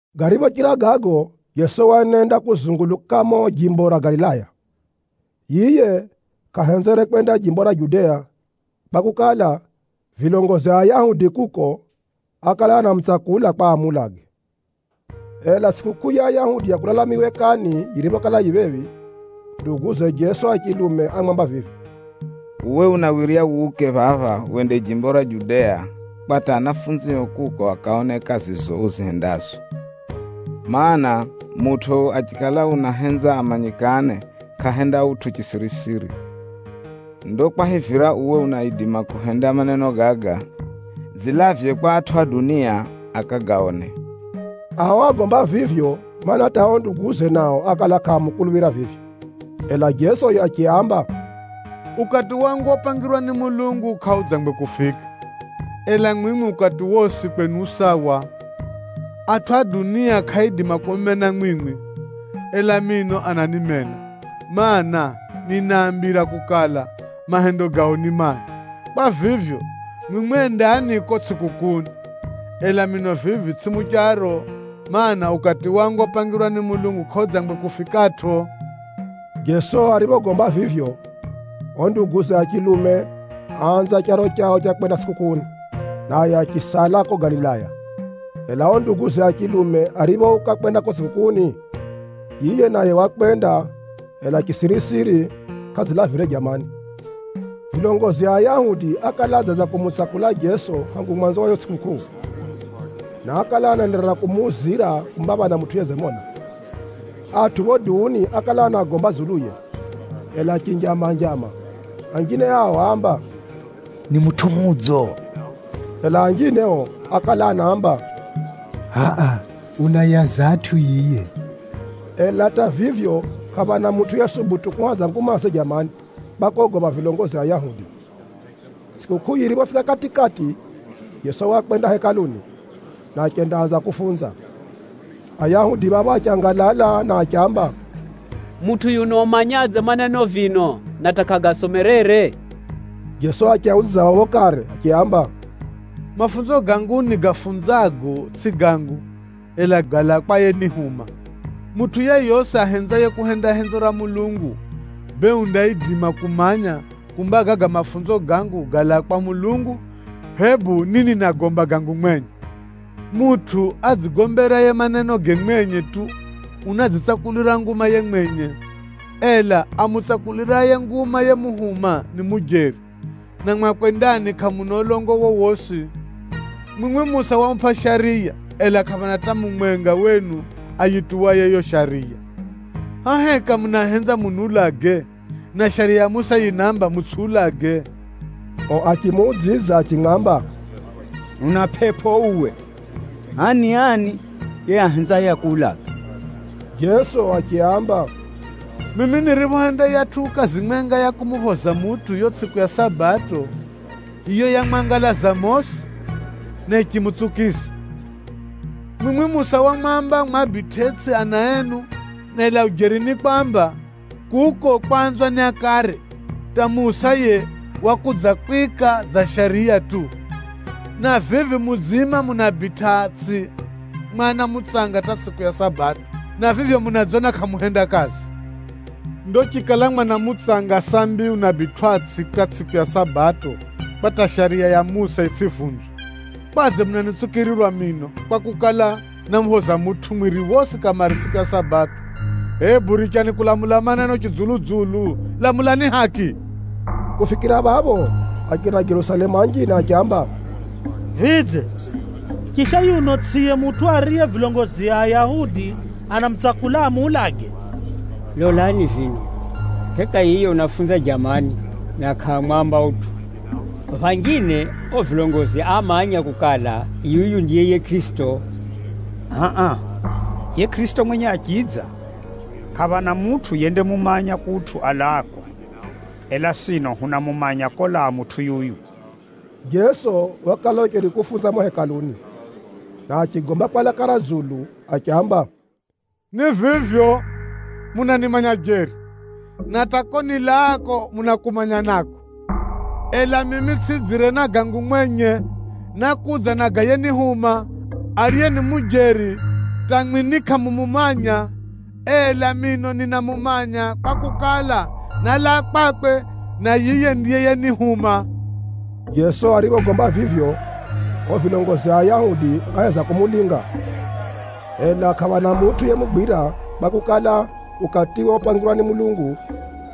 Gariphochira gago, Jeso waenenda kuzunguluka mumo jimbo ra Galilaya. Yiye kʼahenzere kwenda jimbo ra Judea kwakukala, vilongozi a Ayahudi kuko ákala anamutsakula kwa amuulage. Ela tsʼikukʼuu ya Ayahudi ya kulala miwekani yiriphokala yifika phephi, nduguze Jeso a chilume ámwamba vivi, “Uwe unawirya wuke phapha wende jimbo ra Judea, kwa hata anafunzio kuko akaone kazizo uzihendazo. Maana, mutʼu achikala unahenza amanyikane kʼahenda utʼu chisirisiri. Ndo kwahivira uwe unaidima kuhenda maneno gaga, dzilavye kwa atʼu a dunia akagaone.” (Ao ágomba vivyo, mana, hata o nduguze nao ákala kʼaamukuluphira vivyo!) Ela Jeso yiye achiaamba, “Ukati wangu opangirwa ni Mulungu kʼaudzangwe kufika. Ela mwimwi ukati wosi kwenu u sawa. Atʼu a dunia kʼaaidima kumumena mwimwi, ela mino ananimena, mana, ninaambira kukala, mahendo gao ni mai. Kwa vivyo, mwimwi endani kuko tsʼikukʼuuni. Ela mino vivi tsʼimi mucharo, mana, ukati wangu opangirwa ni Mulungu kʼaudzangwe kufikatʼo.” Jeso ariphogomba vivyo, ao nduguze a chilume áanza charo chao cha kwenda tsʼikukʼuuni, naye achisala ko Galilaya. Ela ao nduguze a chilume ariphouka kwenda kuko tsʼikukʼuuni, yiye naye wakwenda, ela chisirisiri, kʼadzilavire jamani. Vilongozi a Ayahudi ákala adzanza kumutsakula Jeso hangu mwanzo wa yiyo tsʼikukʼuu, na ákala anaenderera kumuuzira kumba phana mutʼu yedzimona. Atʼu phapho duuni ákala anagomba dzuluye, ela chinjama-njama. Anjine ao áamba, “Ni mutʼu mudzo.” Ela anjine ao ákala anaamba, “Hʼa-a, unaayaza atʼu yiye.” Ela hata vivyo, kʼaphana mutʼu yesubutu kuhadza ngumaze jamani kwa kogopha vilongozi a Ayahudi. Tsʼikukʼuu yiriphofika kati-kati, Jeso wakwenda Hekaluni, na achendaanza kufunza. Ayahudi phapho achangalala, na achiamba, “Mutʼu yuno umanyadze maneno vino na hata kʼagasomerere?” Jeso achiaudzidza phapho kare achiaamba, “Mafunzo gangu nigafunzago tsʼi gangu, ela galaa kwa yenihuma. Mutʼu yeyosi ahenzaye kuhenda henzo ra Mulungu, bee undaidima kumanya kumba gaga mafunzo gangu galaa kwa Mulungu, hebu ni ninagomba gangu mwenye. Mutʼu adzigomberaye manenoge mwenye tu, unadzitsakulira nguma yiye mwenye. Ela amutsakuliraye nguma yemuhuma, ni mujeri, na mwakwe ndani kʼamuna ulongo wowosi. Mwimwi Musa wamupʼa Shariya, ela kʼaphana hata mumwenga wenu ayituwaye yo Shariya. Hʼa heka munahenza muniulage, na Shariya ya Musa yinaamba, mutsʼiulage?” O achimuudzidza achimwamba, “Una pʼepʼo uwe! Hʼa ni ani yiye ahenzaye akuulage?” Jeso achiaamba, “Mimi niriphohenda yiyatʼu kazi mwenga ya kumuphoza mutʼu yo tsʼiku ya Sabato, yiyo yamwangalaza mosi, na yichimutsukiza. Mwimwi Musa wamwamba mwabitʼetsʼi ana enu, ela ujeri ni kwamba, kuko kwanzwa ni akare, hata Musa yiye wakudzakwika dza shariya tu. Na vivi mudziima munabitʼatsʼi mwana mutsanga hata tsʼiku ya Sabato, na vivyo munadzona kʼamuhenda kazi. Ndo chikala mwana mutsanga sambi unabitwʼatsʼi hata tsʼiku ya Sabato kwa hata Shariya ya Musa yitsʼivunzwe, kwadze munanitsukirirwa mino kwakukala, námuphoza mutʼu mwiri wosi kamare tsʼiku ya Sabato? Hebu richani kulamula maneno chidzulu-dzulu, lamulani haki.” Kufikira phapho, achina Jerusalemu anjine achiamba, “Vidze, chisha yuno tsʼiye mutʼu ariye vilongozi a Ayahudi anamutsakula amuulage? Lolani vino! Heka hiye unafunza jamani, na kʼaamwamba utʼu! Phanjine ao vilongozi amanya kukala, yuyu ndiye yiye Kʼirisito? Hʼa-a, yiye Kʼirisito mwenye achidza, kʼaphana mutʼu yendamumanya kutʼu alaako, ela sino hunamumanya kolaa mutʼu yuyu!” Jeso wakala ucheri kufunza mumo Hekaluni, na achigomba kwa laka ra dzulu achiamba, “Ni vivyo, munanimanya jeri, na hata ko nilaako munakumanya nako! Ela mimi tsʼidzire na gangu mwenye, nákudza na ga yenihuma, ariye ni mujeri hata mwimwi ni kʼamumumanya. Ela mino ninamumanya kwakukala, nálaa kwakwe, na yiye ndiye yenihuma.” Jeso ariphogomba vivyo, ao vilongozi a Ayahudi áheza kumulinga, ela kʼaphana mutʼu yemugwira kwakukala, ukatiwe opangirwa ni Mulungu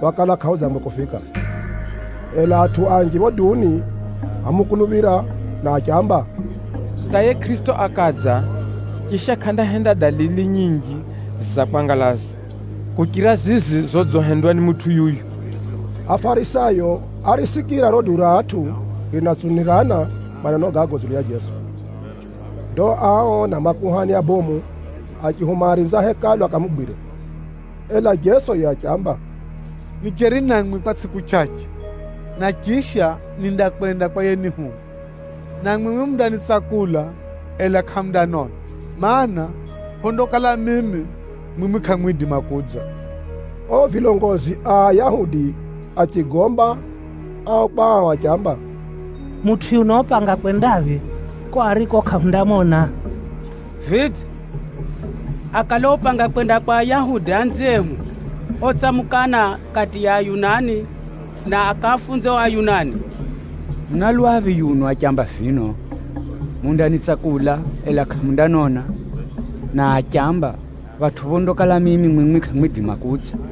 wakala kʼaudzangwe kufika. Ela atʼu anji phapho duuni ámukuluphira, na achiamba, “Hata yiye Kʼirisito akadza, chisha kʼandahenda dalili nyinji za kwangalaza, kuchira zizi zodzihendwa ni mutʼu yuyu!” Afarisayo árisikira riro duu ra atʼu rinatsunirana maneno gago dzulu ya Jeso. Ndo ao na makuhani abomu achihuma arinzi a Hekalu akamugwire. Ela Jeso yiye achiamba, “Nicheri namwi kwa tsʼiku chʼachʼe, na chisha nindakwenda kwa yenihuma. Na mwimwi mundanitsakula, ela kʼamundanona, mana, phondakala mimi, mwimwi kʼamwidima kudza.” Ao vilongozi a Ayahudi achigomba ao kwa ao achiamba, “Mutʼu yuno upanga kwendaphi kuko ariko kʼahundamona? Vidze, akale upanga kwenda kwa Ayahudi anziehu otsamukana kati ya Ayunani, na akafunze ao Ayunani? Una lwaphi yuno achiamba vino, ‘Mundanitsakula, ela kʼamundanona,’ na achiamba, ‘Phatʼu phondakala mimi, mwimwi kʼamwidima kudza’?”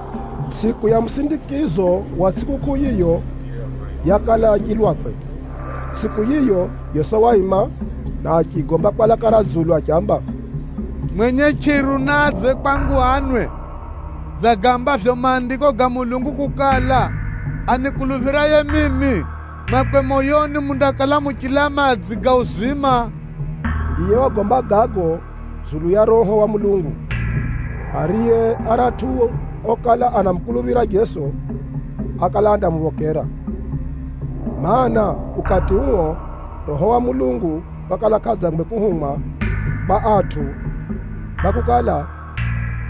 Tsʼiku ya musindikizo wa tsʼikukʼuu yiyo, yakala ya chilwakwe. Tsʼiku yiyo Jeso waima, na achigomba kwa laka ra dzulu achiamba, “Mwenye chʼiru naadze kwangu anwe. Dza gaambavyo Maandiko ga Mulungu kukala, ‘Anikuluphiraye mimi, mwakwe moyoni mundakala muchilaa madzi ga uzima!’” (Yiye wagomba gago dzulu ya Roho wa Mulungu, ariye aratʼu okala anamukuluphira Jeso, ákala andamuphokera. Maana, ukati uo Roho wa Mulungu wakala kʼadzangwe kuhumwa kwa atʼu kwakukala,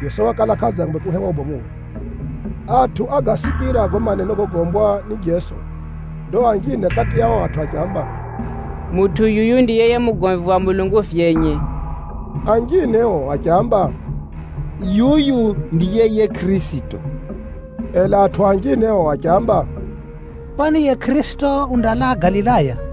Jeso wakala kʼadzangwe kuhewa ubomuwe.) Atʼu ágasikira gago maneno gogombwa ni Jeso. Ndo anjine kati ya ao atʼu achiamba, “Mutʼu yuyu ndiye yiye mugomvi wa Mulungu vyenye!” Anjine ao achiamba, “Yuyu ndiye yiye Kʼirisito!” Ela atʼu anjine ao achiamba, “Kwani yiye Kʼirisito undalaa Galilaya?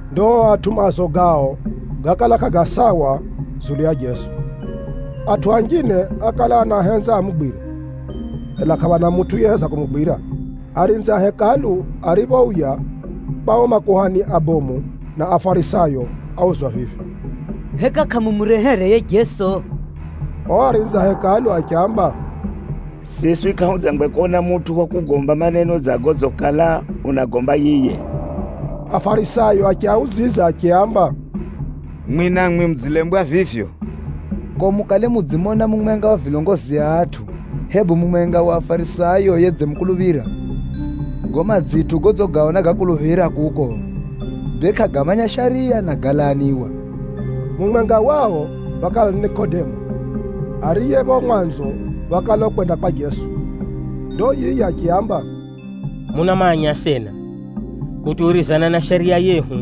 Ndo ao atʼu maazo gao gákala kʼaga sawa dzulu ya Jeso. Atʼu anjine ákala anahenza amugwire, ela kʼaphana mutʼu yeheza kumugwira. Arinzi a Hekalu ariphouya kwa ao makuhani abomu na Afarisayo, áuzwa vivi, “Heka kʼamumurehere yiye Jeso?” Ao arinzi a Hekalu achiamba, “Siswi kʼahudzangwe kona mutʼu wa kugomba maneno dza godzikala unagagomba yiye!” Afarisayo achiaudzidza achiaamba, “Mwimwi namwi mudzilembwa vivyo? Kuko mukale mudzimona mumwenga wa vilongozi a atʼu, hebu mumwenga wa Afarisayo yedzimukuluphira? Gago madzitʼu godzigaona gakuluphira kuko, bee kʼagamanya Shariya, na galaniwa.” Mumwenga wao wakala ni Nikodemo, ariye phapho mwanzo wakala ukwenda kwa Jeso. Ndo yiye achiaamba, “Munamanya asena, kutuwirizana na shariya yehu,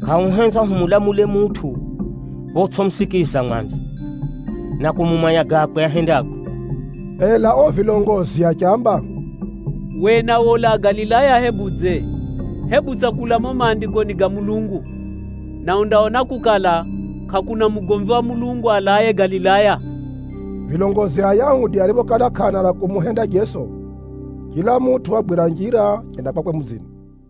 kʼahuhenzwa hulamule mutʼu photsʼimusikiza mwanzo, na kumumanya gakwe ahendago.” Ela ao vilongozi achiamba, “Uwe nawe ulaa Galilaya hebudze? Hebu tsakula mumo Maandikoni ga Mulungu, na undaona kukala, kʼakuna mugomvi wa Mulungu alaaye Galilaya!” Vilongozi a Ayahudi ariphokala kʼaana ra kumuhenda Jeso, chila mutʼu wagwira njira achenda kwakwe mudzini.